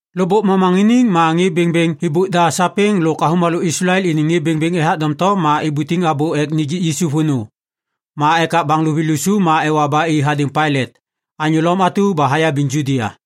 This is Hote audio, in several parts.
Lôkbôk momaŋiniŋ ma ŋê bêŋbêŋ êbôk da sapêŋ lôk avômalô Islael iniŋ ŋê bêŋbêŋ ethak doŋtom ma ibutiŋ abô ek nijik Yisu vônô. Ma ekak baŋ luvi lusu ma ewa ba i hadêŋ Pailat, anyô Lom atu ba hayabiŋ Judia.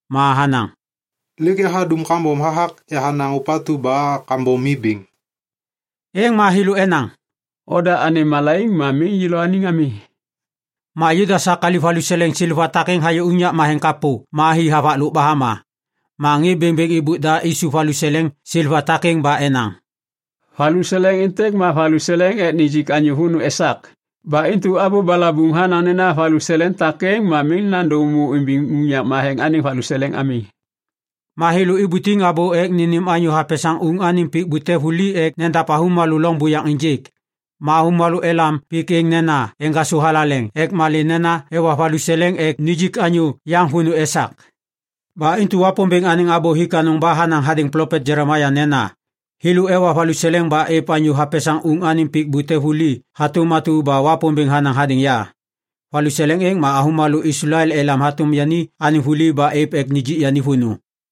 ma hanaŋ, “Lêk yahadum kambom hathak yahanaŋ ôpatu ba kambom mi bêŋ.” Êŋ ma thêlô enaŋ, “Oda anêm malaiŋ ma miŋ yêlôaniŋ ami.” Ma Judas hakaliv valuseleŋ seleva takêŋ hayô unyak matheŋ kapô ma hi havaklôk ba hama. Ma ŋê bêŋbêŋ êbôk da isup valuseleŋ seleva takêŋ ba enaŋ, “Valuseleŋ êntêk ma valuseleŋ êv ek nijik anyô vônô esak. Ba intu abô balabuŋ hanaŋ nena valuseleŋ takêŋ ma miŋ nandô êmô imbiŋ unyak matheŋ anêŋ valuseleŋ ami.” Ma thêlô ibutiŋ abô ek nênêm anyô hapesaŋ uŋ anêŋ pik bute vuli ek nedav avômalô loŋ buyaŋ ênjêk. Ma avômalô elam pik êŋ nena “Eŋgasô Thalaleŋ” ek malê nena ewa valuseleŋ ek nijik anyô yaŋ vônô esak. Ba intu Wapômbêŋ anêŋ abô hik anôŋ ba hanaŋ hadêŋ plopet Jelemaia nena, “Thêlô ewa valuseleŋ ba êv anyô hapesaŋ uŋ anêŋ pik bute vuli hatôm atu ba Wapômbêŋ hanaŋ hadêŋ ya. Valuseleŋ êŋ ma avômalô Islael elam hatôm yani anêŋ vuli ba êv ek nijik yani vônô.”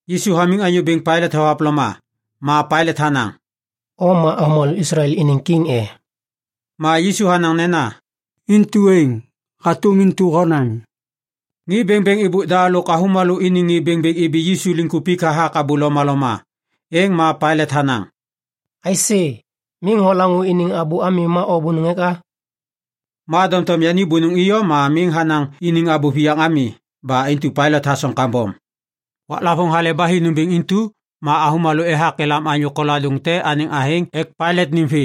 Yisu hamiŋ anyô bêŋ Pailat thohavloma, ma Pailat hanaŋ, “O ma avômalô Islael iniŋ kiŋ e?” Ma Yisu hanaŋ nena, “Intu êŋ, hatôm intu honaŋ.” Ŋê bêŋbêŋ êbôk da lôk avômalô iniŋ ŋê bêŋbêŋ ibi Yisu liŋkupik hathak abô lomaloma. Êŋ ma Pailat hanaŋ, “Aisê! Miŋ holaŋô iniŋ abô ami ma o bônôŋ eka?” Ma doŋtom yani bônôŋ iyom ma miŋ hanaŋ iniŋ abô viyaŋ ami. Ba intu Pailat hasoŋ kambom. Waklavôŋ Hale ba Hi nômbêŋ intu, ma avômalô ethak elam anyô koladôŋ te anêŋ athêŋ ek Pailat nêm vê.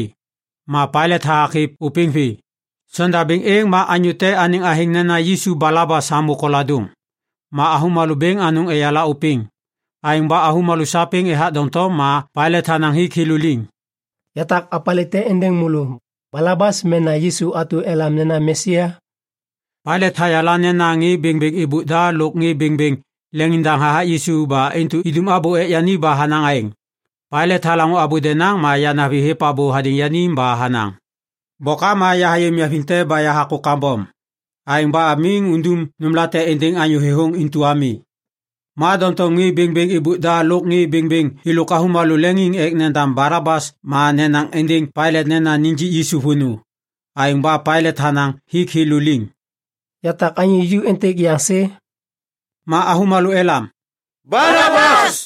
Ma Pailat hathak hêv ôpêŋ vê. Sondabêŋ êŋ ma anyô te anêŋ athêŋ nena Yisu Balabas hamô koladôŋ. Ma avômalô bêŋ anôŋ eyala ôpêŋ. Aêŋ ba avômalô sapêŋ ethak doŋtom ma Pailat hanaŋ hik thêlô liŋ, “Yatak opalê te êndêŋ môlô, Balabas mena Yisu atu ba elam nena Mesia?” Pailat hayala nena ŋê bêŋbêŋ êbôk da lôk ŋê bêŋbêŋ leŋiŋdaŋ hathak Yisu ba intu idum abô ek yani ba hanaŋ aêŋ. Pailat halaŋô abô denaŋ ma yanavi hêv abô hadêŋ yani ba hanaŋ, “Bôkam ma yahayê niaviŋ te ba yahakô kambom. Aêŋ ba miŋ undum nômlate êndêŋ anyô thêthôŋ intu ami.” Ma doŋtom ŋê bêŋbêŋ êbôk da lôk ŋê bêŋbêŋ êlôk avômalô leŋiŋ ek nendam Balabas ma nenaŋ êndêŋ Pailat nena nijik Yisu vônô. Aêŋ ba Pailat hanaŋ hik thêlô liŋ, “Yatak anyô ju êntêk yaŋ sê?” Ma avômalô elam, “Balabas.”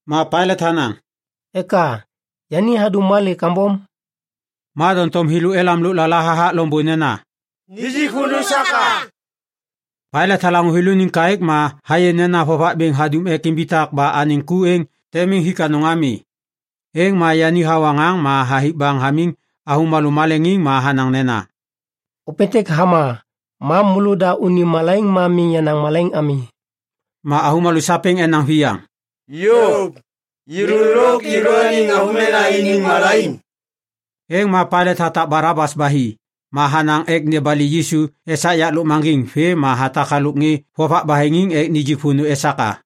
Ma Pailat hanaŋ, “Eka? Yani hadum malê kambom?” Ma doŋtom thêlô elam lôklala hathak loŋbô nena, “Nijik vônô esak a!” Pailat halaŋô thêlôniŋ kaêk ma hayê nena vovak bêŋ hadum ek imbitak ba anêŋ ku êŋ tem miŋ hik anôŋ ami. Êŋ ma yani hawa ŋaŋ ma hathik baŋ hamiŋ avômalô maleŋiŋ ma hanaŋ nena, “Ôpêntêk hama, ma môlôda unim malaiŋ ma miŋ yenaŋ malaiŋ ami!” Ma avômalô sapêŋ enaŋ viyaŋ, “Yôv! Yêlô lôk yêlôaniŋ avômena iniŋ malaiŋ!” Êŋ ma Pailat hatak Balabas ba hi. Ma hanaŋ ek nebali Yisu esak yak lôkmaŋgiŋ vêm ma hatak halôk ŋê vovak baheŋiŋ ek nijik vônô esak a.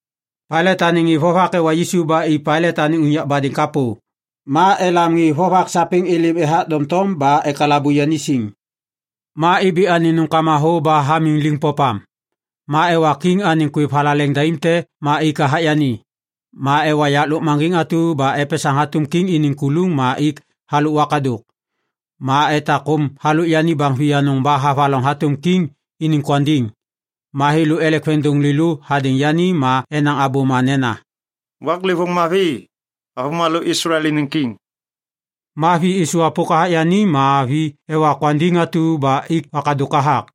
Pailat anêŋ ŋê vovak ewa Yisu ba i Pailat anêŋ unyak badêŋ kapô. Ma elam ŋê vovak sapêŋ êlêm ethak doŋtom ba ekalabu yani siŋ. Ma ibi anêŋ nômkama thô ba hamiŋ liŋ popam. Ma ewa kiŋ anêŋ kwêv thalaleŋ daim te ma ik hathak yani. Ma ewa yak lôkmaŋgiŋ atu ba epesaŋ hatôm kiŋ iniŋ kuluŋ ma ik halôk wakadôk. Ma etak kôm halôk yani baŋ vianôŋ ba havaloŋ hatôm kiŋ iniŋ kwandiŋ. Ma thêlô elek veŋiŋdôŋ lêlô hadêŋ yani ma enaŋ abôma nena, “Waklêvôŋ mavi, avômalô Islael iniŋ kiŋ!” Ma vi êsôvwapôk hathak yani ma vi ewa kwandiŋ atu ba ik wakadôk hathak.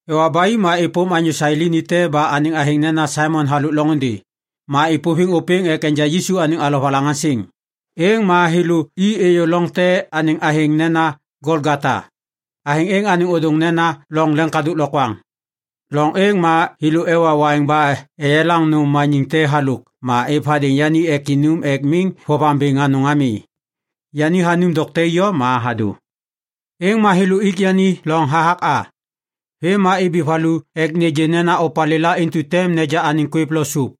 Ewa ba i ma êpôm anyô Sailini te ba anêŋ athêŋ nena Saimon halôk loŋôndê. Ma êpôviŋ ôpêŋ ek enja Yisu anêŋ alovalaŋaŋsiŋ. Êŋ ma thêlô i êyô loŋ te anêŋ athêŋ nena Golgota, athêŋ êŋ anêŋ ôdôŋ nena Loŋ Leŋkadôk Lokwaŋ. Loŋ êŋ ma thêlô ewa waiŋ ba eyelaŋ nôm maniŋ te halôk ma êv hadêŋ yani ek inum ek miŋ vovaŋ bêŋ anôŋ ami. Yani hanum dokte iyom ma hadô. Êŋ ma thêlô ik yani loŋ hathak a. Vêm ma ibi valu ek nêgê nena opalêla intu tem neja anêŋ kwêv lo sôp.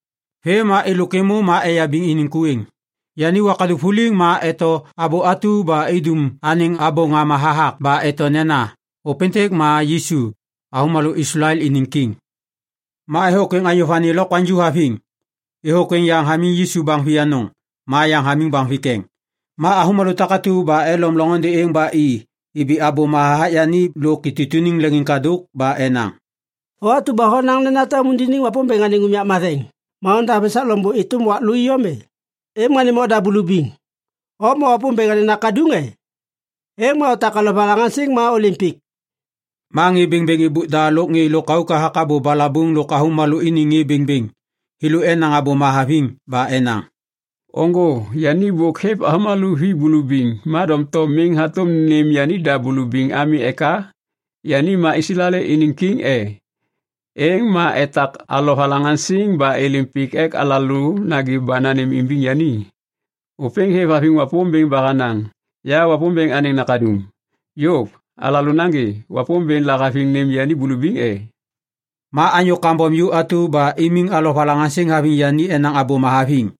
Vêm ma êlôk êmô ma eyabiŋ iniŋ ku êŋ. Yani wakadôk vuliŋ ma eto abô atu ba idum anêŋ abô ŋama hathak ba eto nena, ÔPÊNTÊK MA YISU, AVÔMALÔ ISLAEL INIŊ KIŊ Ma êthôkwêŋ anyô vani lokwaŋju haviŋ. Êthôkwêŋ yaŋ hamiŋ Yisu baŋ vianôŋ, ma yaŋ hamiŋ baŋ vikeŋ. Ma avômalô takatu ba elom loŋôndê êŋ ba i ibi abôma hathak yani lôk itutuniŋ leŋiŋkadôk ba enaŋ, “O atu ba honaŋ nena tem undiniŋ Wapômbêŋ anêŋ unyak matheŋ ma ondav esak loŋbô êtôm wak lô iyom e? Êŋ ma nêm oda bulubiŋ! O ma Wapômbêŋ anêŋ Nakaduŋ, e? Êŋ ma otak alovalaŋaŋsiŋ ma ôlêm pik!” Ma ŋê bêŋbêŋ êbôk da lôk ŋê lôkauk hathak abô balabuŋ lôk avômalô iniŋ ŋê bêŋbêŋ, thêlô enaŋ abôma haviŋ ba enaŋ, “Ôŋgô! Yani bôk hêv avômalô vi bulubiŋ, ma doŋtom miŋ hatôm nêm yanida bulubiŋ ami eka? Yani ma Islael iniŋ kiŋ e? Êŋ ma etak alovalaŋaŋsiŋ ba êlêm pik ek alalô nagê ba nanêmimbiŋ yani! Ôpêŋ hêvhaviŋ Wapômbêŋ ba hanaŋ, ‘Ya Wapômbêŋ anêŋ Nakaduŋ’. Yôv! Alalô nagê! Wapômbêŋ lahaviŋ nêm yani bulubiŋ e?” Ma anyô kambom ju atu ba imiŋ alovalaŋaŋsiŋ haviŋ yani enaŋ abôma haviŋ.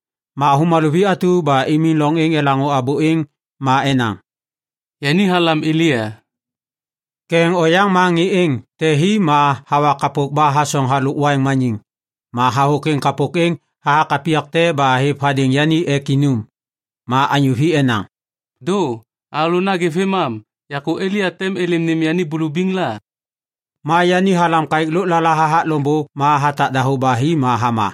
Ma avômalô vi atu ba imiŋ loŋ êŋ elaŋô abô êŋ ma enaŋ, “Yani halam Elia!” Ketheŋ oyaŋ ma ŋê êŋ te hi ma hawa kapôk ba hasoŋ halôk waiŋ maniŋ. Ma hathôkwêŋ kapôk êŋ hathak apiyak te ba hêv hadêŋ yani ek inum. Ma anyô vi enaŋ, “Dô! Alalô nagê vêmam! Yakô Elia tem êlêm nêm yani bulubiŋ la?” Ma yani halam kaêk lôklala hathak loŋbô ma hatak dahô ba hi ma hama.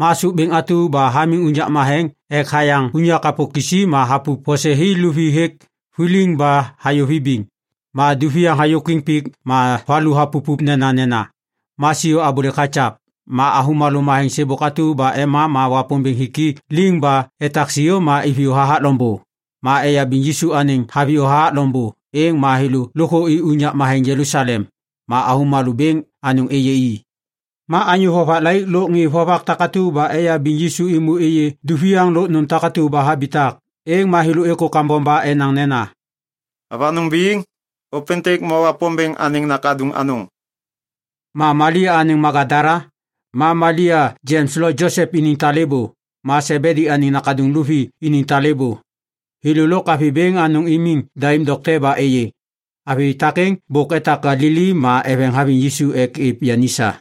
Ma sôp bêŋ atu ba hamiŋ unyak matheŋ ek hayaŋ unyak kapô kisi ma hapup vose hi luvi hêk vuliŋ ba hayô vibiŋ. Ma duviaŋ hayôkwiŋ pik ma valu hapupup nenanena. Ma siô abôlêk hakyav. Ma avômalô matheŋ sêbôk atu ba ema ma Wapômbêŋ hik i liŋ ba etak siô ma iviyô hathak loŋbô. Ma eyabiŋ Yisu anêŋ haviyô hathak loŋbô, êŋ ma thêlô lôkthô i unyak matheŋ Jelusalem. Ma avômalô bêŋ anôŋ êyê i. Ma anyô vovak laik lôk ŋê vovak takatu ba eyabiŋ Yisu êmô êyê duviaŋ lôk nôm takatu ba habitak. Êŋ ma thêlô êkô kambom ba enaŋ nena, “Avanôŋ biŋ, ôpêntêk ma Wapômbêŋ anêŋ Nakaduŋ anôŋ!” Ma Malia anêŋ Magadala, ma Malia Jems lo Josep iniŋ talêbô, ma Sebedi anêŋ nakaduŋ luvi iniŋ talêbô, thêlô lôk avi bêŋ anôŋ imiŋ daim dokte ba êyê. Avi takêŋ bôk etak Galili ma eveŋ haviŋ Yisu ek êv yani sa.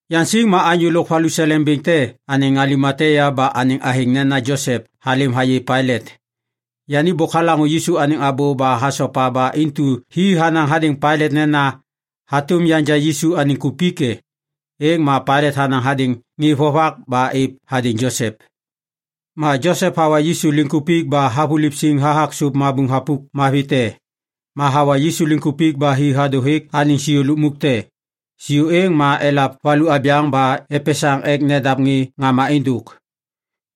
Yaŋsiŋ ma anyô lôk valuseleŋ bêŋ te anêŋ Alimatia ba anêŋ athêŋ nena Josep halêm hayê Pailat. Yani bôk halaŋô Yisu anêŋ abô ba hasopa ba intu hi hanaŋ hadêŋ Pailat nena, “Hatôm yanja Yisu anêŋ kupik e?” Êŋ ma Pailat hanaŋ hadêŋ ŋê vovak ba êv hadêŋ Josep. Ma Josep hawa Yisu liŋkupik ba havuliv siŋ hathak sôp thapuk mabuŋ mavi te. Ma hawa Yisu liŋkupik ba hi hadô hêk anêŋ siô lukmuk te. Siô êŋ ma elav valu abyaŋ ba epesaŋ ek nedav ŋê ŋama êndôk.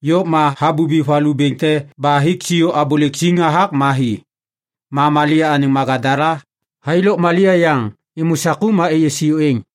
Yôv ma habubi valu bêŋ te ba hik siô abôlêk siŋ hathak ma hi. Ma Malia anêŋ Magadala, thai lôk Malia yaŋ, êmô saku ma êyê siô êŋ.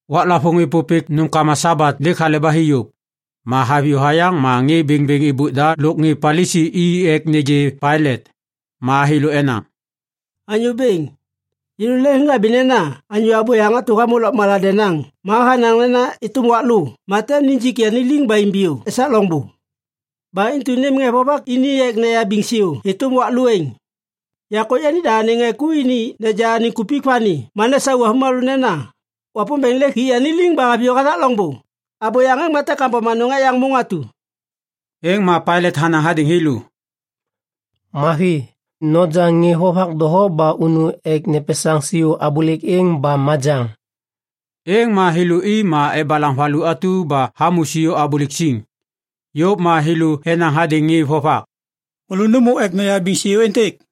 Waklavôŋ êpôpêk nômkama Sabat lêk hale ba hi yôv. Ma haviyô hayaŋ ma ŋê bêŋbêŋ êbôk da lôk ŋê Palisi i ek nêgê Pailat. Ma thêlô enaŋ, “Anyô bêŋ, yêlô leŋhabi nena anyô abôyaŋ atu hamô lôkmala denaŋ ma hanaŋ nena êtôm wak lô, ma tem nijik yani liŋ ba imbiyô esak loŋbô. “Ba intu nêm ŋê vovak ini ek neyabiŋ siô êtôm wak lô êŋ. Yakô yanida anêŋ ŋê ku ini neja anêŋ kupik vani ma nesau avômalô nena, ‘Wapômbêŋ lêk hik yani liŋ ba haviyô hathak loŋbô.’ Abôyaŋ êŋ ma tem kambom anôŋ ek yaŋ môŋ atu.” Êŋ ma Pailat hanaŋ hadêŋ thêlô, “Mavi. Noja ŋê vovak doho ba unu ek nepesaŋ siô abôlêk êŋ ba majaŋ.” Êŋ ma thêlô i ma ebalaŋ valu atu ba hamô siô abôlêk siŋ. Yôv ma thêlô enaŋ hadêŋ ŋê vovak, “Môlô nômô ek noyabiŋ siô êntêk.”